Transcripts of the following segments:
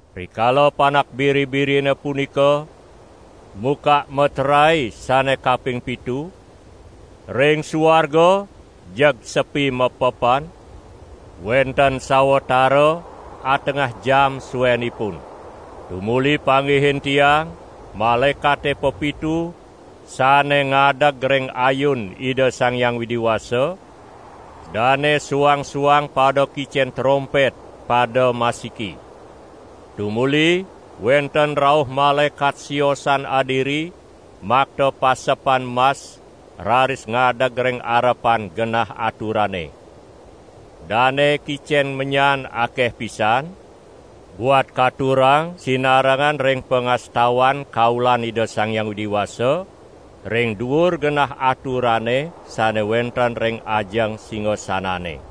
Rikala Panak Biri-birine punika mukak meterae sane kaping pitu, ring suarga jeg sepi mapepan, wenten sawatara atengah jam suenipun. Tumuli panggihin tiang malaekate pepitu sane ngadeg ring ayun Ida Sang Hyang Widi Wasa; dane suang-suang pada kicen trompet pada masiki. Tumuli wenten rauh malaekat siosan adiri makta pasepan mas raris ngadeg ring arepan genah aturane. Dane kicen menyan akeh pisan, buat katurang sinarengan ring pangastawan kaulan Ida Sang Hyang Widi Wasa ring duur genah aturane sane wenten ring ajeng singasanane.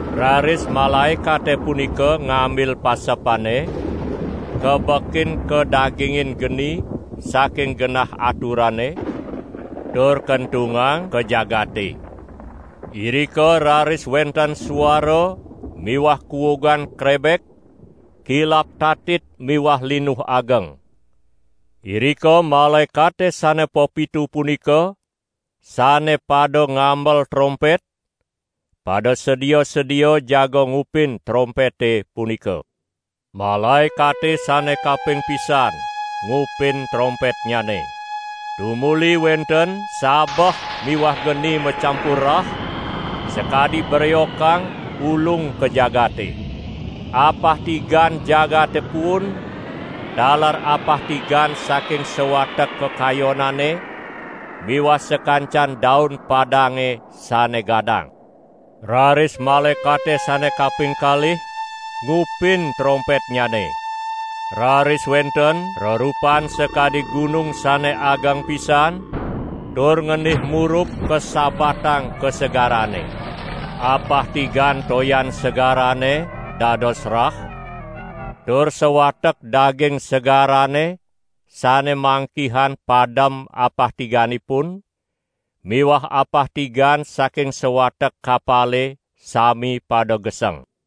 Raris malaekate punika ngambil pasepane, kabekin kadagingin geni saking genah aturane, tur kentungang ka jagate. Irika raris wenten suara miwah kuugan krebek, kilap tatit miwah linuh ageng. Irika malaekate sane pepitu punika sane pada ngamel trompet, pada sedia-sedia jaga ngupin trompete punika. Malaekate sane kaping pisan ngupin trompetnyane. Tumuli wenten sabeh miwah geni macampur rah, sakadi breokang ulung ka jagate. Apah tigan jagate puun, taler apah tigan saking sawatek kakayonane miwah sakancan daun padange sane gadang. Raris malaekate sane kaping kalih ngupin trompetnyane. Raris wenten rerupan sakadi gunung sane ageng pisan, tur ngendih murub kasabatang ka segarane. Apah tigan toyan segarane dados rah, tur sawatek daging segarane sane mangkihan padem apah tiganipun miwah apah tigan saking sawatek kapale sami pada geseng.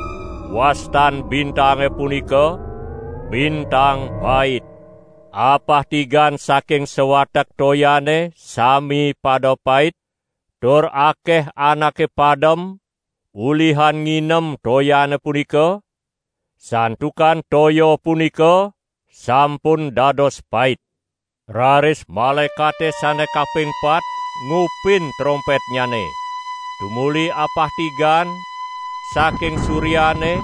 (Wastan bintange punika bintang Pait.) Apah tigan saking sawatek toyane sami pada pait, tur akeh anake padem ulihan nginem toyane punika, santukan toya punika sampun dados pait. Raris malaekate sane kaping pat ngupin trompetnyane. Tumuli apah tigan saking suryane,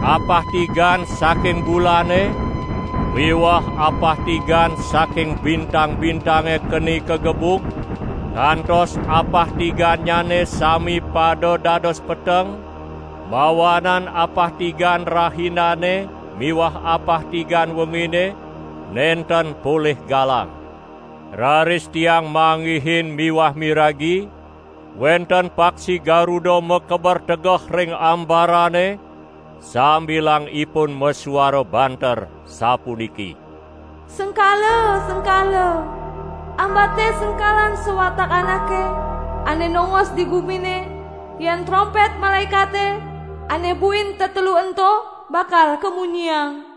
apah tigan saking bulane miwah apah tigan saking bintang-bintange keni kagebug, kantos apah tigannyane sami pada dados peteng, mawanan apah tigan rahinane miwah apah tigan wengine nenten polih galang. Raris tiang manggihin miwah miragi wenten paksi garuda makeber tegeh ring ambarane sambilang ipun masuara banter sapuniki: "Sengkala, sengkala! Ambate sengkalan sawatek anake ane nongos di gumine, yen trompet malaekate ane buin tetelu ento bakal kamunyiang!"